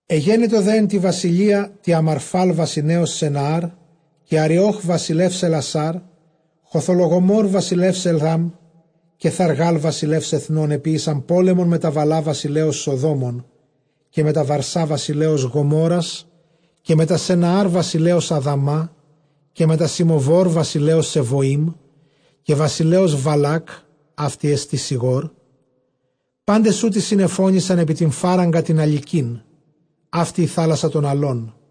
Ἐγένετο δὲ ἐν τῇ βασιλείᾳ τῇ Ἀμαρφὰλ βασιλέως Σενναὰρ, καὶ Ἀριὼχ βασιλέως Ἑλλασὰρ, Χοδολλογομὸρ βασιλεὺς Ἐλὰμ, καὶ Θαργὰλ βασιλεὺς ἐθνῶν, ἐποίησαν πόλεμον μετὰ Βαλλὰ βασιλέως Σοδόμων, καὶ μετὰ Βαρσὰ βασιλέως Γομόῤῥας, καὶ μετὰ Σενναὰρ βασιλέως Ἀδαμὰ, καὶ μετὰ Συμοβὸρ βασιλέως Σεβωεὶμ, καὶ βασιλέως Βαλάκ· αὕτη ἐστὶ Σηγώρ. Πάντες οὗτοι συνεφώνησαν ἐπὶ τὴν φάραγγα τὴν ἁλυκήν· αὕτη ἡ θάλασσα τῶν ἁλῶν.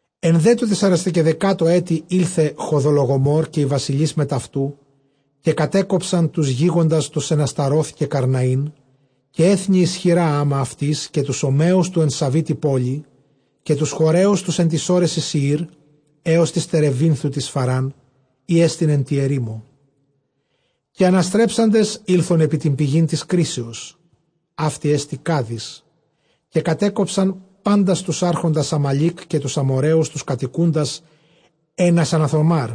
Ἐν δὲ τῷ τεσσαρεσκαιδεκάτῳ ἔτει ἦλθε Χοδολλογομὸρ καὶ οἱ βασιλεῖς μετʼ αὐτοῦ, καὶ κατέκοψαν τοὺς γίγαντας τοὺς ἐν Ἀσταρὼθ, καὶ Καρναῒν, καὶ ἔθνη ἰσχυρὰ ἅμα αὐτοῖς, καὶ τοὺς Ὀμμαίους τοὺς ἐν Σαυῇ τῇ πόλει. Καὶ τοὺς Χοῤῥαίους τοὺς ἐν τοῖς ὄρεσι Σηεὶρ, ἕως τῆς τερεβίνθου τῆς Φαρὰν, ἥ ἐστιν ἐν τῇ ἐρήμῳ. Καὶ ἀναστρέψαντες ἦλθον ἐπὶ τὴν πηγὴν τῆς κρίσεως· αὕτη ἐστὶ Κάδης· καὶ κατέκοψαν πάντας τοὺς ἄρχοντας Ἀμαλὴκ, καὶ τοὺς Ἀμοῤῥαίους τοὺς κατοικοῦντας ἐν ʼΑσασονθαμὰρ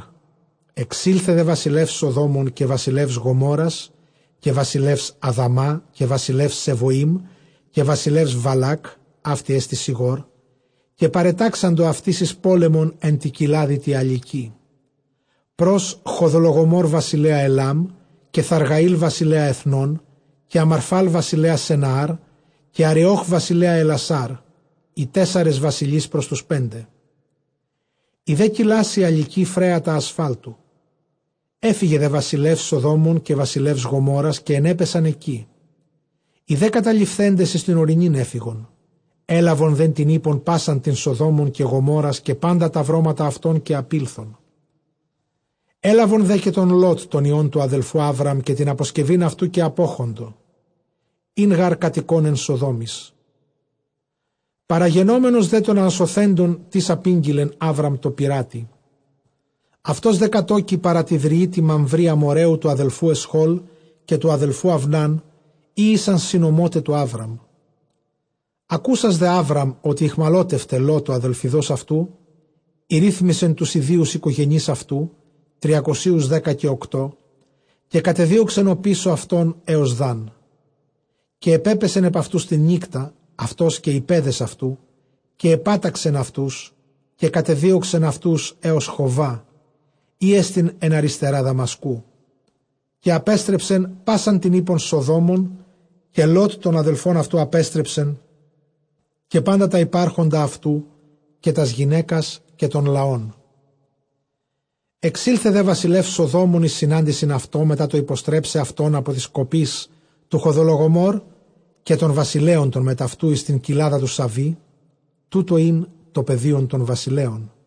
Ἐξῆλθε δὲ βασιλεὺς Σοδόμων, καὶ βασιλεὺς Γομόῤῥας, καὶ βασιλεὺς Ἀδαμὰ, καὶ βασιλεὺς Σεβωεὶμ, καὶ βασιλεὺς Βαλάκ· αὕτη ἐστὶ Σηγώρ· καὶ παρετάξαντο αὐτοῖς εἰς πόλεμον ἐν τῇ κοιλάδι, τῇ ἁλυκῇ, πρὸς Χοδολλογομὸρ βασιλέα Ἐλὰμ, καὶ Θαπγὰλ βασιλέα ἐθνῶν, καὶ Ἀμαρφὰλ βασιλέα Σενναὰρ, καὶ Ἀριὼχ βασιλέα Ἑλλασὰρ, οἱ τέσσαρες βασιλεῖς πρὸς τοὺς πέντε. Ἡ δὲ κοιλὰς ἡ ἁλυκὴ, φρέατα ἀσφάλτου· ἔφυγε δὲ βασιλεὺς Σοδόμων καὶ βασιλεὺς Γομόῤῥας, καὶ ἐνέπεσαν ἐκεῖ· οἱ δὲ καταλειφθέντες εἰς τὴν ὀρεινὴν ἔφυγον. Ἔλαβον δὲ τὴν ἵππον πᾶσαν τὴν Σοδόμων καὶ Γομόῤῥας, καὶ πάντα τὰ βρώματα αὐτῶν, καὶ ἀπῆλθον. Ἔλαβον δὲ καὶ τὸν Λὼτ τὸν υἱὸν τοῦ ἀδελφοῦ Ἅβραμ, καὶ τὴν ἀποσκευὴν αὐτοῦ, καὶ ἀπῴχοντο· ἦν γὰρ κατοικῶν ἐν Σοδόμοις. Παραγενόμενος δὲ τῶν ἀνασωθέντων τις ἀπήγγειλεν Ἅβραμ τῷ περάτῃ· αὐτὸς δὲ κατῴκει παρὰ τῇ δρυῒ τῇ Μαμβρῇ Ἀμοῤῥαίου τοῦ ἀδελφοῦ Ἐσχὼλ, καὶ τοῦ ἀδελφοῦ Αὐνὰν, οἳ ἦσαν συνωμόται τοῦ Ἅβραμ. Ἀκούσας δὲ Ἅβραμ ὅτι ᾐχμαλώτευται Λὼτ ὁ ἀδελφοῦς αὐτοῦ, ἠρίθμησε τοὺς ἰδίους οἰκογενεῖς αὐτοῦ τριακοσίους δέκα καὶ ὀκτώ· καὶ κατεδίωξεν ὀπίσω αὐτῶν ἕως Δάν. Καὶ ἐπέπεσεν ἐπʼ αὐτοὺς τὴν νύκτα αὐτὸς, καὶ οἱ παῖδες αὐτοῦ, καὶ ἐπάταξεν αὐτοὺς, καὶ κατεδίωξεν αὐτοὺς ἕως Χοβὰ, ἥ ἐστιν ἐν ἀριστερᾷ Δαμασκοῦ. Καὶ ἀπέστρεψε πᾶσαν τὴν ἵππον Σοδόμων· καὶ Λὼτ τὸν ἀδελφιδοῦν αὐτοῦ ἀπέστρεψε, καὶ πάντα τὰ ὑπάρχοντα αὐτοῦ, καὶ τὰς γυναῖκας, καὶ τὸν λαόν. Ἐξῆλθε δὲ βασιλεὺς Σοδόμων εἰς συνάντησιν αὐτῷ, μετὰ τὸ ὑποστρέψαι αὐτὸν ἀπὸ τῆς κοπῆς τοῦ Χοδολλογομὸρ, καὶ τῶν βασιλέων τῶν μετʼ αὐτοῦ εἰς τὴν κοιλάδα τοῦ Σαβύ· τοῦτο ἦν τὸ πεδίον τῶν βασιλέων.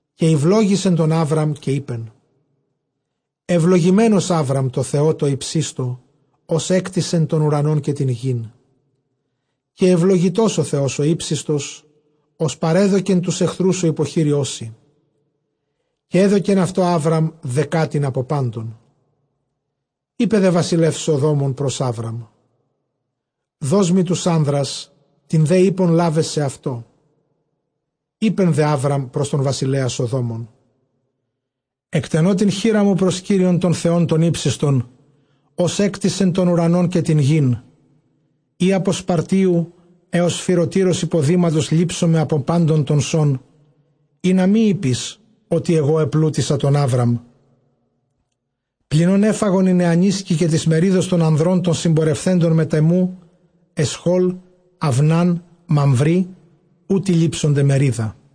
Καὶ εὐλόγησε τὸν Ἅβραμ, καὶ εἶπεν, εὐλογημένος Ἅβραμ τῷ Θεῷ τῷ ὑψίστῳ, ὃς ἔκτισε τὸν οὐρανὸν καὶ τὴν γῆν. Καὶ εὐλογητὸς ὁ Θεὸς ὁ ὕψιστος, ὃς παρέδωκε τοὺς ἐχθρούς σου ὑποχειρίους σοι· καὶ ἔδωκεν αὐτῷ Ἅβραμ δεκάτην ἀπὸ πάντων. Εἶπε δὲ βασιλεὺς Σοδόμων πρὸς Ἅβραμ, δός μοι τοὺς ἄνδρας, τὴν δὲ ἵππον λάβε σεαυτῷ. Εἶπε δὲ Ἅβραμ πρὸς τὸν βασιλέα Σοδόμων, ἐκτενῶ τὴν χεῖρά μου πρὸς Κύριον τὸν Θεὸν τὸν ὕψιστον, ὃς ἔκτισε τὸν οὐρανὸν καὶ τὴν γῆν, εἰ ἀπὸ σπαρτίου ἕως σφυρωτῆρος ὑποδήματος λήψομαι ἀπὸ πάντων τῶν σῶν, ἵνα μὴ εἴπῃς, ὅτι ἐγὼ ἐπλούτισα τὸν Ἅβραμ. Πλὴν ὧν ἔφαγον οἱ νεανίσκοι, καὶ τῆς μερίδος τῶν ἀνδρῶν τῶν συμπορευθέντων μετʼ ἐμοῦ Ἐσχὼλ, Αὐνᾶν, Μαμβρῆ· οὗτοι λήψονται μερίδα.